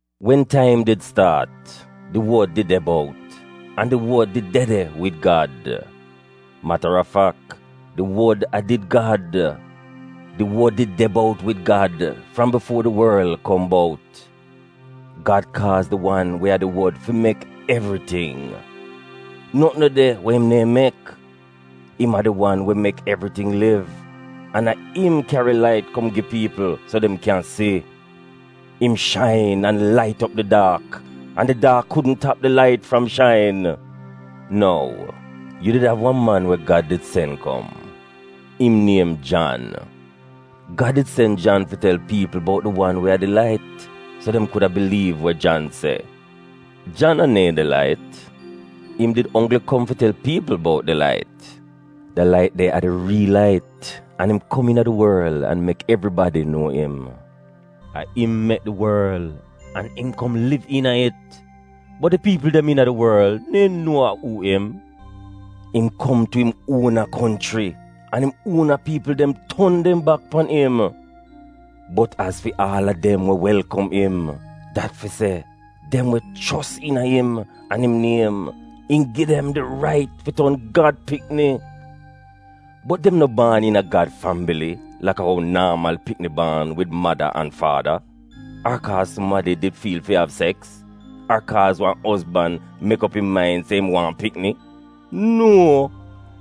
Wen taim did staat, di Wod did de bout, an di Wod did de de wid Gad. Matarafak, di Wod a did Gad. Di Wod did de bout wid Gad fram bifuo di worl kom bout. Gad kaaz di wan we a di Wod fi mek evriting. Notn no de we im neehn mek. Im a di wan we mek evriting liv, an a im kyari lait kom gi piipl so dem kyan si. Im shain an lait op di daak an di daak kudn tap di lait fram shain! Nou, yu did av wan man we Gad did sen kom. Im niem Jan. Gad did sen Jan fi tel piipl bout di wan we a di lait, so dem kuda biliiv we Jan se. Jan a neehn di lait. Im did onggl kom fi tel piipl bout di lait. Da lait de a di riil lait an im kom iina di worl an mek evribadi nuo im. A im mek di worl an im kom liv iina it, bot di piipl dem iina di worl neehn nuo a uu im. Im kom tu im uona konchri an im uona piipl dem ton dem bak pan im. Bot az fi aal a dem we welkom im — dat fi se, dem we chos iina im an im niem, im gi dem di rait fi ton Gad pikni. Bot dem no baan iina Gad fambili laka ou naamal pikni baan wid mada an faada, ar kaaz sumadi did fiil fi av seks, ar kaaz wan ozban mek op im main se im waahn pikni. Nuo!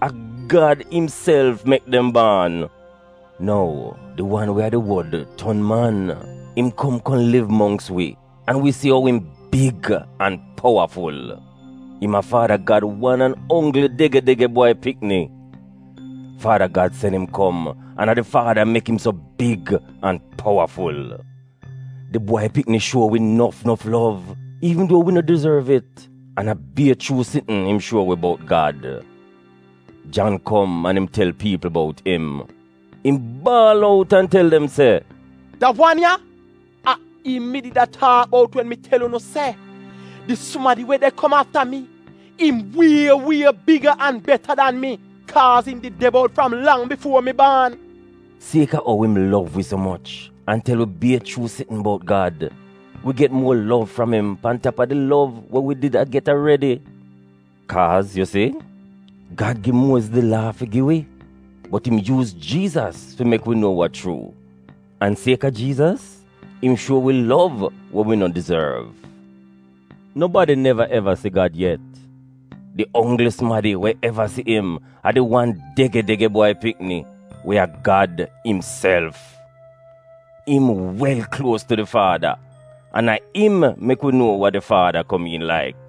A Gad imself mek dem baan. Nou, di wan we a di Wod ton man, im kom kom liv mongks wi, an wi si ou im big an powaful. Im a Faada Gad wan an onggl dege-dege Bwai Pikni. Faada Gad sen im kom an a di Faada mek im so big an powaful. Di Bwai Pikni shuo wi nof nof lov iivn duo wi no dizorv it, an a bier chuu sitn im shuo wi bout Gad. Jan kom an im tel piipl bout im. Im baal out an tel dem se, “Da wan ya, a im mi did a taak bout wen mi tel unu se, ‘Di sumadi we de kom afta mi, im wie wie biga an beta dan mi, kaaz im did de bout fram lang bifuo mi baan.’” Sieka ou im lov wi so moch an tel wi bier chuu sitn bout Gad, wi get muo lov fram im pan tap a di lov we wi did a get aredi. Kaaz, yu si, Gad gi Muoziz di Laa fi gi wi, bot im yuuz Jiizas fi mek wi nuo wa chuu, an sieka Jiizas, im shuo wi lov we wi no dizorv. Nobadi neva eva si Gad yet. Di onggl sumadi we eva si im a di wan dege-dege Bwai Pikni, we a Gad imself. Im wel kluos tu di Faada, an a im mek wi nuo wa di Faada komiin laik.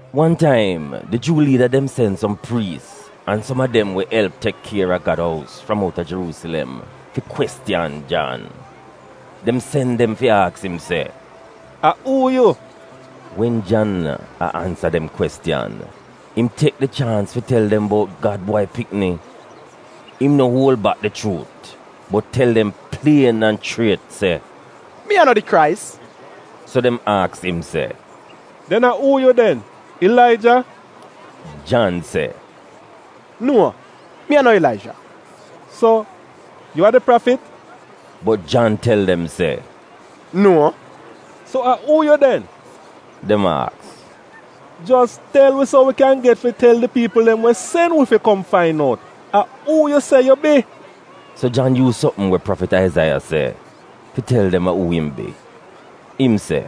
Wan taim, di Juu liida dem sen som priis an som a dem we elp tek kier a Gad ous fram outa Jeruusilem fi kwestiyan Jan. Dem sen dem fi aks im se, “A uu yu?” Wen Jan a ansa dem kwestiyan, im tek di chaans fi tel dem bout Gad Bwai Pikni. Im no uol bak di chuut, bot tel dem plien an chriet se, “Mi a no di Krais.” So dem aks im se, “Den a uu yu den? Ilaija?” Jan se, “Nuo, mi a no Ilaija!” “So, yu a di prafit?” Bot Jan tel dem se, “Nuo!” “So a uu yu den?” dem aks. “Jos tel wi so wi kyan get fi tel di piipl dem we sen wi fi kom fain out. A uu yu se yu bi?” So Jan yuuz sopm we prafit Aizaiya se, fi tel dem a uu im bi. Im se,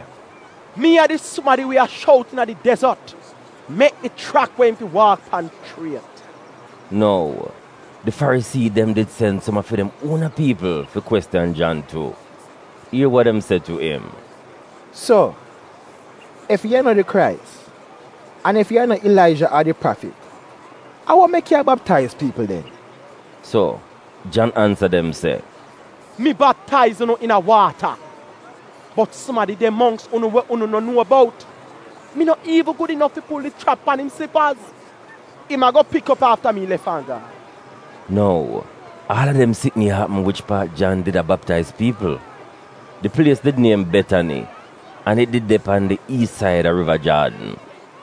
“Mi a di sumadi we a shout iina di dezot, ‘Mek di chrak we im fi waak pan chriet.’” Nou, di Farisii dem did sen som a fi dem uona piipl fi kwestiyan Jan tu. Ier wa dem se tu im, “So, ef yu a no di Krais, an ef yu a no Ilaija ar di Prafit, a wa mek yu a baptaiz piipl den?” So, Jan ansa dem se, “Mi baptaiz unu iina waata, bot sumadi de mongks unu we unu no nuo bout. Mi no iivn gud inof fi pul di schrap dem pan im slipaz. Im ago pik op afta mi lef an gaan.” Nou, aal a dem sitn ya apm wich paat Jan did a baptaiz piipl. Di plies did niem Betani, an it did de pan di iis said a Riva Jaadn.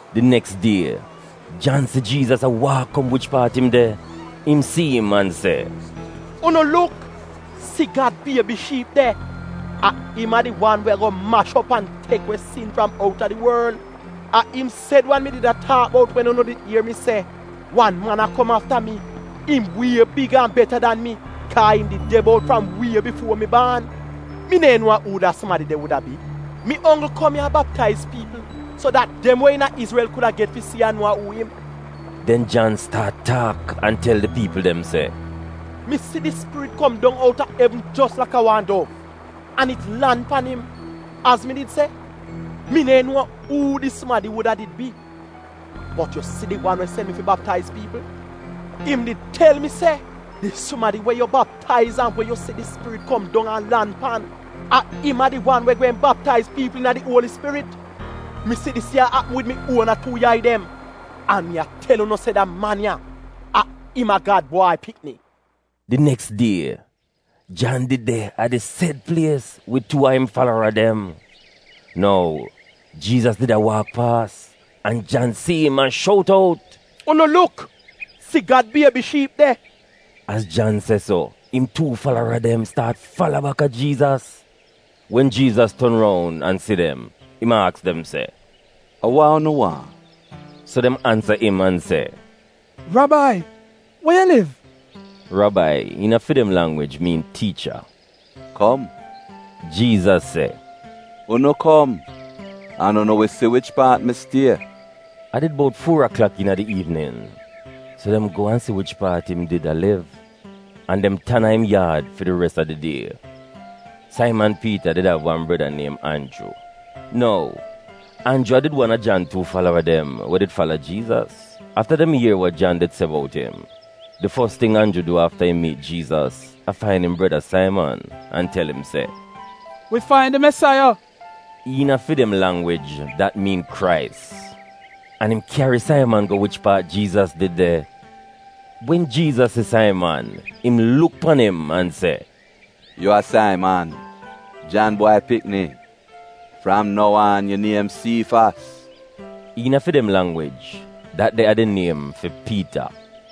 Di neks die, Jan si Jiizas a waak kom wich paat im de. Im si im an se, “Unu luk! Si Gad biebi shiip de! A im a di wan we ago mash op an tek we sin fram outa di worl! A im sed wan mi did a taak bout wen unu did ier mi se, ‘Wan man a kom afta mi, im wie biga an beta dan mi, kaa im did de bout wie bifuo mi baan.’ Mi neehn nuo a uu da sumadi de wuda bi. Mi onggl kom ya a baptaiz piipl, so dat dem we iina Izrel kuda get fi si an nuo a uu im.” Den Jan staat taak an tel di piipl dem se, “Mi si di Spirit kom dong outa evn jos laka wan dov, an it lan pan im. Az mi did se, mi neehn nuo uu di sumadi wuda did bi. Bot, yu si di wan we sen mi fi baptaiz piipl, im did tel mi se, ‘Di sumadi we yu baptaiz an we yu si di Spirit kom dong an lan pan, a im a di wan we gweehn baptaiz piipl iina di Uoli Spirit.’ Mi si dis ya apm wid mi uona tuu yai dem, an mi a tel unu se da man ya, a im a Gad Bwai Pikni.” Di neks die, Jan did de a di sed plies wid tuu a im falara dem. Nou, Jiizas did a waak paas, an Jan si im an shout out, “Unu luk! Si Gad biebi shiip de!” Az Jan se so, im tuu falara dem staat fala baka Jiizas. Wen Jiizas ton roun an si dem, im aks dem se, “A wa unu waahn?” So dem ansa im an se, “Rabai, we yu liv?” (Rabai iina fi dem langwij miin tiicha.) “Kom,” Jiizas se, “unu kom, an unu wi si wich paat mi stie” (a did bout fuo aklak iina di iivnin). So dem go an si wich paat im did a liv an dem tan a im yaad fi di res a di die. Saiman Piita did av wan breda niem Anju. Nou, Anju a did wan a Jan tuu falara dem we did fala Jiizas afta dem ier wa Jan did se bout im. Di fos ting Anju du afta im miit Jiizas a fain im breda, Saiman, an tel im se, “Wi fain di Mesaiya” (iina fi dem langwij dat miin Krais). An im kyari Saiman go wich paat Jiizas did de. Wen Jiizas si Saiman, im luk pan im an se, “Yu a Saiman, Jan bwai pikni. Fram nou aan, yu niem Siifas” (iina fi dem langwij, dat de a di niem fi Piita).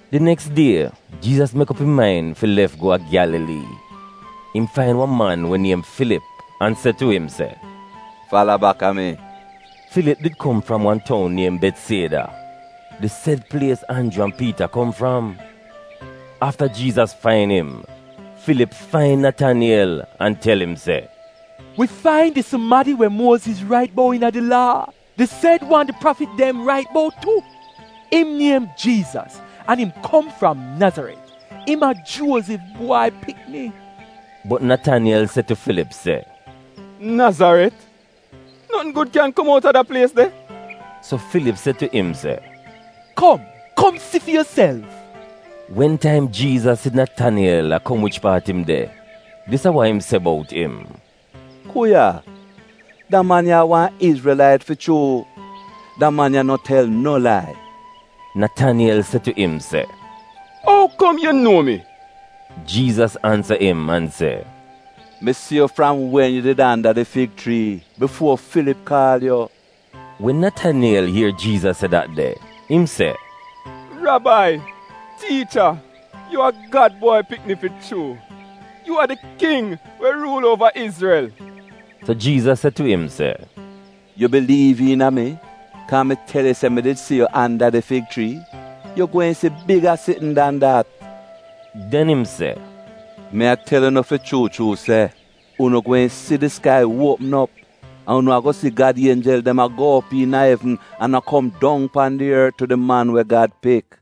Di neks die, Jiizas mek op im main fi lef go a Gyalalii. Im fain wan man we niem Filip an se tu im se, “Fala baka mi.” Filip did kom fram wan toun niem Betsieda, di sed plies Anju an Piita kom fram. Afta Jiizas fain im, Filip fain Nataniyel an tel im se, “Wi fain di sumadi we Muoziz rait bout iina di Laa, di sed wan di prafit dem rait bout tu. Im niem Jiizas an im kom fram Nazaret. Im a Juozif bwai pikni.” Bot Nataniyel se tu Filip se, “Nazaret? Notn gud kyan kom outa dat de plies de?” So Filip se tu im se, “Kom kom si fi yuself.” Wen taim Jiizas si Nataniyel a kom wich paat im de, dis a wa im se bout im, “Ku ya! Da man ya a wan Izrelait fi chuu! Da man ya no tel no lai.” Nataniyel se tu im se, “Ou kom yu nuo mi?” Jiizas ansa im an se, “Mi si yu fram wen yu did anda di fig chrii, bifuo Filip kaal yu.” Wen Nataniyel ier Jiizas se dat de, im se, “Rabai! Tiicha! Yu a Gad Bwai Pikni fi chuu! Yu a di King we ruul uova Izrel!” So Jiizas se tu im se, “Yu biliiv iina mi kaa mi tel yu se mi did si yu anda di fig chrii? Yu gweehn si biga sitn dan dat.” Den im se, “Mi a tel unu fi chuu chuu se unu gweehn si di skai uopm op, an unu ago si Gad ienjel dem a go op iina evn an a kom dong pan di ort tu di Man we Gad Pik.”